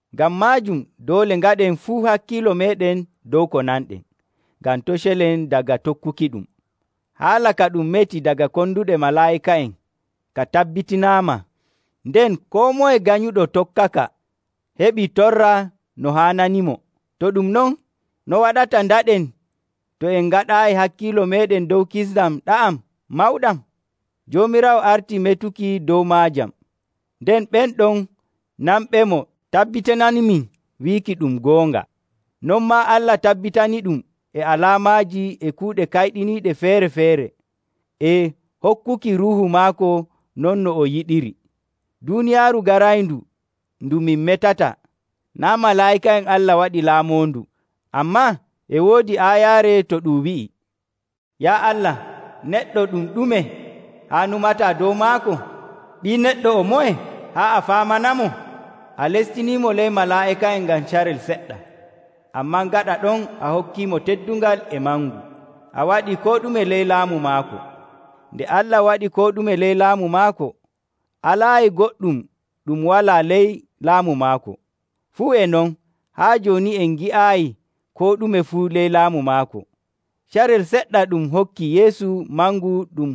Ngam maajum doole ngaɗen fuu hakkiilo meeɗen dow ko nanɗen, ngam to' celen daga tokkukiɗum. Haala ka ɗum meti daga konduɗe malaa'ika'en ka tabbitinaama, nden koo moye ganyuɗo tokkaka heɓii torra no haananimo. To ɗum non, no waɗata ndaɗen to en ngaɗaayi hakkiilo meeɗen dow kisndam ɗa'am mawɗam? Joomiraawo artii metuki dow maajam, nden ɓen ɗon nanɓemo tabbitinaniimin wiiki ɗum goonga. Non maa Allah tabbitiniiɗum e alaamaaji, e kuuɗe kayɗiniiɗe feere‑feere, e hokkuki Ruuhu maako non no o yiɗiri. Duuniyaaru garayndu ndu min metata, naa' malaa'ika'en Allah waɗi laamoondu. Ammaa e woodi aayaare to ɗum wi'i, “Yaa Allah, neɗɗo ɗum ɗume haa nyumataa dow maako? Ɓii Neɗɗo o moye haa a faamanamo? A lestiniimo ley malaa'ika'en ngam carel seɗɗa, ammaa gaɗa ɗon a hokkiimo teddungal e mangu, a waɗii koo ɗume ley laamu maako.” Nde Allah waɗi koo ɗume ley laamu maako, alaayi goɗɗum ɗum walaa ley laamu maako. Fuu e non, haa jooni en ngi'aayi koo ɗume fuu ley laamu maako. Carel seɗɗa ɗum hokki Yeesu mangu ɗum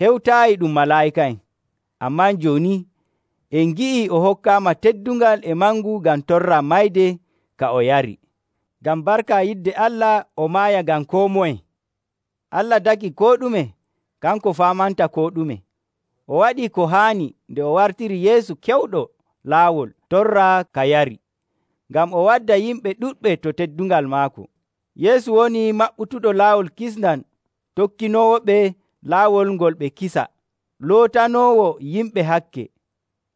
hewtaayi ɗum malaa'ika'en. Ammaa jooni en ngi'ii o hokkaama teddungal e mangu ngam torra mayde ka o yari, ngam barka yidde Allah o maaya ngam koo moye. Allah tagi koo ɗume, kanko faamanta koo ɗume. O waɗii ko haani nde o wartiri Yeesu kewɗo laawol torra ka yari, ngam o wadda yimɓe ɗuɗɓe to teddungal maako. Yeesu woni maɓɓutuɗo laawol kisndam tokkinoowoɓe laawol ngol ɓe kisa. Lootanoowo yimɓe hakke,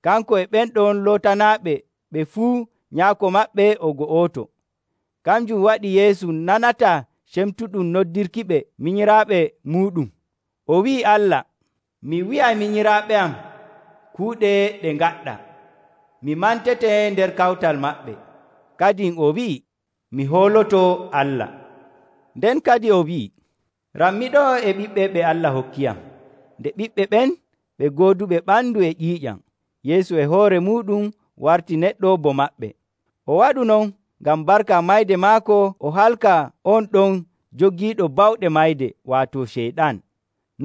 kanko e ɓen ɗon lootanaaɓe ɓe fuu Nyaako maɓɓe o go'oto. Kanjum waɗi Yeesu nanataa cemtuɗum noddirkiɓe minyiraaɓe muuɗum. O wi'ii Allah, “Mi wi'ay minyiraaɓe am kuuɗe ɗe ngaɗɗaa, mi mantete nder kawtal maɓɓe.” Kadin o wi'ii, “Mi hooloto Allah.” Nden kadin o wi'ii, “Rammi ɗo'o e ɓiɓɓe ɓe Allah hokkiyam.” Nde ɓiɓɓe ɓen ɓe gooduɓe ɓandu e ƴiiƴam, Yeesu e hoore muuɗum wartii neɗɗo bo maɓɓe. O waɗu non ngam barka mayde maako o halka on ɗon jogiiɗo bawɗe mayde, waato Ceyɗan.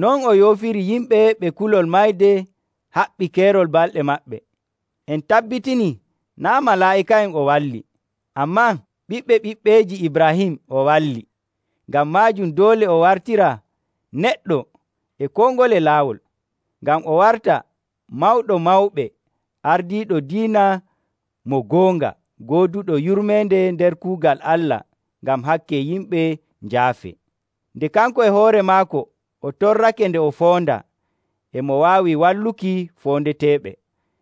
Non o yoofiri yimɓe ɓe kulol mayde haɓɓi keerol balɗe maɓɓe. En tabbitinii naa' malaa'ika'en o walli, ammaa ɓiɓɓe ɓiɓɓeeji Ibraahim o walli. Ngam maajum doole o wartiraa neɗɗo e koo ngole laawol, ngam o warta mawɗo mawɓe ardiiɗo diina mo goonga gooduɗo yurmeende nder kuugal Allah ngam hakke yimɓe njaafee. Nde kanko e hoore maako o torrake nde o foondaa, e mo waawi walluki foondeteeɓe.